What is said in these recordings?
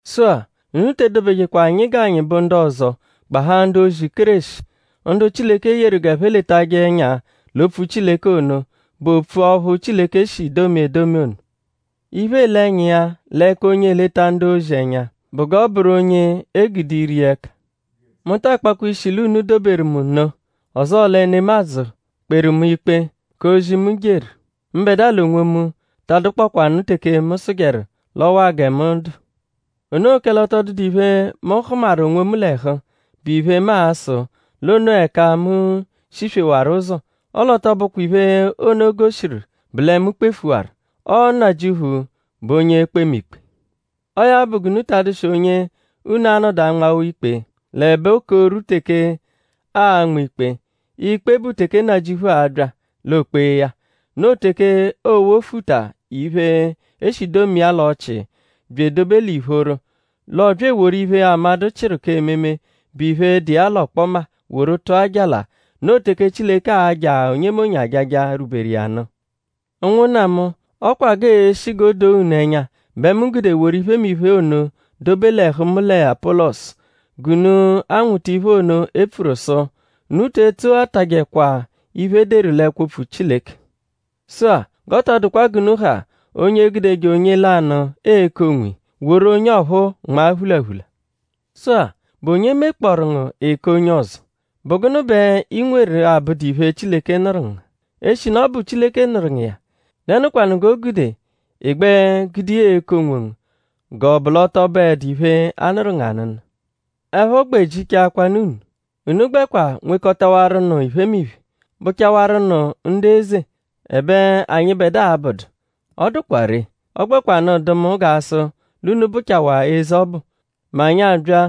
Sụ-a; unu te edobejekwa anyi g'anyi bụ ndu ọzo gbahaa ndu-ozi Kéreshi; ndu Chileke yeru g'ẹphe letajẹ ẹnya l'opfu Chileke ono, bụ opfu ọphu Chileke shi domia edomi ono. Iphe, eele ẹnya iya l'ẹka onye eleta ndu-ozi ẹnya bụ g'ọ bụru onye e gude ire iya ẹka. Mu ta akpakwa ishi l'unu doberu mu nno; ọzoo lẹ nemadzụ kperu mu ikpe k'ozi, mu jeru; mbẹdua l'onwomu ta adụkpokwanu teke mu sụjeru l'ọ waa gẹ mu dụ; o noo kẹle ọ tọ dụdu iphe, mu hụmaru onwomu l'ẹhu, bụ iphe, mu a-sụ l'o noo ẹka mu shiswewaru ụzo; ọle ọ tọ bụkwa iphe ono goshiru lẹ mu kpefuwaru. Ọo Nnajịuphu bụ onye e-kpe mu ikpe. Ọo ya bụ g'unu ta adụshi onye unu a-nọdu anmawa ikpe l'ẹbe 'oko rwu teke aa-nma ikpe; ikpe bụ teke Nnajịuphu a-bya; l'o kpee ya. Noo teke oo-wofuta iphe, e shi domia l'ọchii bya edobe l'ìphóró; l'ọ bya eworu iphe, amadụ chịru k'ememe, bụ iphe, dụ iya l'ọkpoma; woru tụa jala. Noo teke Chileke a-ja onyemonye ajaja, rwuberu iya nụ. Ụnwunna mu; ọ kwa g'e-shi g'o doo unu ẹnya bẹ mu gude woru iphemiphe ono dobe l'ẹhu mu lẹ Apọlosu; g'unu anwụta iphe ono, e pfuru sụ: “Unu te etsoghatajẹkwa iphe, e deru l'ẹkwo-opfu Chileke.” Sụ-a; g'ọ tọ dụkwa g'unu ha onye egudeje onye lanụ eku onwiya; woru onye ọphu nmaa phulaphula. Sụ-a;?bụ onye mekpọoru ngu ị ka onye ọzo??Bụ gụnu bẹ i nweru 'abụdu iphe, Chileke nụru ngu? Eshinu ọ bụ Chileke nụru ngu iya;?dẹnukwanu g'o gude ị gbẹ gude iya eku onwongu g'ọ -bụ l'ọ tọ bụedu iphe, a nụru ngu anụnu? Ẹpho gbẹ jichaakwanụ unu! Unu gbẹkwa nwekọtawaru nụ iphemiphe; bụchawaru nụ ndu eze; ẹbe anyịbedua abụdu. Ọ dụkwa ree. Ọ gbẹkwanu dụ mu g'a sụ l'unu bụchawaa eze ọbu; mẹ anyi abya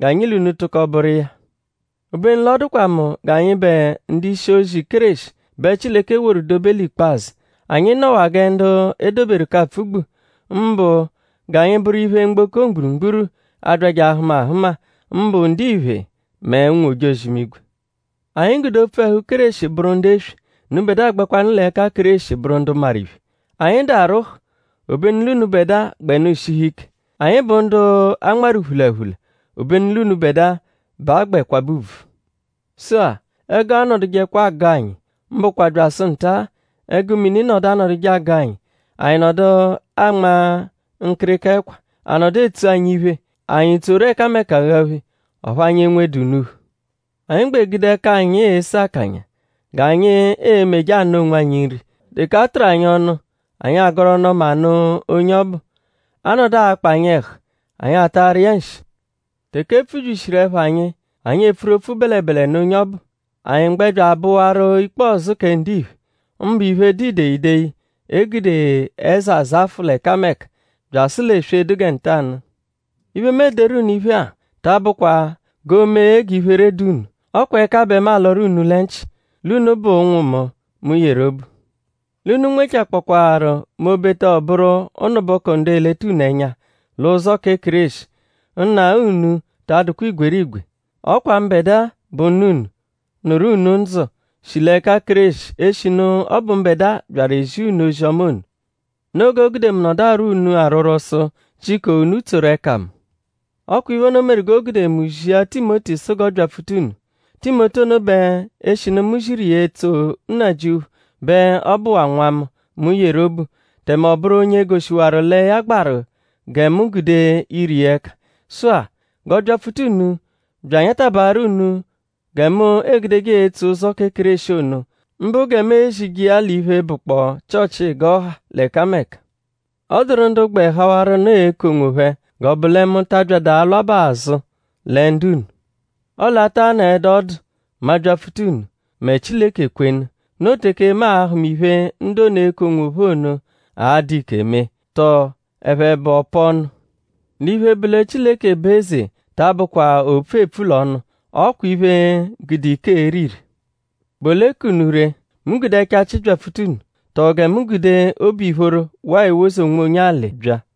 g'anyi l'unu tụko bụru iya. Obenu l'ọ dụkwa mu g'anyịbe ndu-ishi-ozi Kéreshi bẹ Chileke woru dobe l'ikpazụ. Anyi nọwaa gẹ ndu e doberu k'apfụ-gbu; mbụ g'anyi bụru iphe, mgboko mgburugburu, a-byajẹ ahụma ahụma; mbụ ndiphe mẹ ụnwu-ojozi-imigwe. Anyi gude opfu ẹhu Kéreshi bụru ndu eswe; unubẹdua gbẹwanu l'ẹka Kéreshi bụru ndu maru iphe. Anyi dụ arwụhu; obenu l'unubẹdua gbẹnu shihu ike! Anyi bụ ndu a nmarụ phulaphula; obenu l'unubẹdua bẹ a gbẹ kwabẹ ùbvù. Sụ-a; ẹgu anọdujekwa agụ anyi; mbụkwa byasụ nta-a; ẹgu mini nọdu anọduje agụ anyi; anyi nọdu anma nkịrika ẹkwa; a nọdu etsu anyi iphe; anyi tsoru ẹkameka aghaphe; ọphu anyi enwedu unuphu. Anyi gbẹ gude ẹka anyi ese akanya g'anyi e-meje anụ onwanyi nri. Teke a tụru anyi ọnu; anyi agọru ọnu-ọma nụ onye ọbu. A -nọdu akpa anyi ẹhu; anyi atarụ iya nshi. Teke e pfubyishiru ẹpha anyi; anyi epfuru opfu bẹlebele nụ onye ọbu; anyi gbẹ bya abụwaru ikpọzu kẹ ndiphe; mbụ iphe, dụ ideyideyi, e gude ẹza zafụ l'ẹkameka; byasụ l'eswe, dụ gẹ ntanụ-a. Iphe, mu ederu unu iphe-a ta abụkwa g'o mee g'iphere dụ unu. Ọ kwa ẹka bẹ mu alọru unu lẹ nchị; l'unu bụ ụnwu mu, mu yeru obu. L'unu -nwechakpọkwaaru m'obeta ọ bụru ụnubuku ndu eleta unu ẹnya l'ụzo kẹ Kéreshi; nna unu ta adụkwa igwerigwe. Ọ kwa mbẹdua bụ nna unu, nụru unu ndzụ, shi l'ẹka Kéreshi; eshinu ọ bụ mbẹdua byaru ezia unu ozi-ọma ono. Noo g'o gude mu nọdu arwọ unu arwọrwo sụ; jiko unu tsoru ẹka mu. Ọ kwa iphe ono meru g'o gude mu zia Timoti sụ g'ọ byapfuta unu. Timoti ono bẹ eshinu mu ziru iya etso Nnajịuphu bẹ ọ bụwaa nwa mu, mu yeru obu; tẹme ọ bụru onye goshiwaru lẹ ya gbaru gẹ mu gude ire iya ẹka. Sụ-a; g'ọ byapfuta unu bya anyatabaaru unu gẹ mu egudeje etso ụzo kẹ Kéreshi ono; mbụ gẹ mu ezije iya l'iphe, bụkpoo Chịochi g'ọ ha l'ẹkameka. Ọ dụru ndu gbẹ hawaru nụ eku onwophẹ; g'ọ bụ lẹ mu ta abyadụ alwabaa azụ lẹ ndu-unu. Ọle a taa nọedu ọdu; mu abyapfuta unu; mẹ Chileke kwenu. Noo teke mu a-hụma iphe, ndu ono, eku onwophẹ ono a-dụ ike mee; tọo ẹphe bụ ọ-pa-ọnu. L'iphe, bụ lẹ Chileke bụ eze ta abụkwa opfu, eepfu l'ọnu; ọ kwa iphe, gude ike ere ire. ?Bụ ole ka unu ree??Mu gude ẹchachi byapfuta unu??Tọo gẹ mu gude obu-ìphóró waa ewoze onwonye alị bya?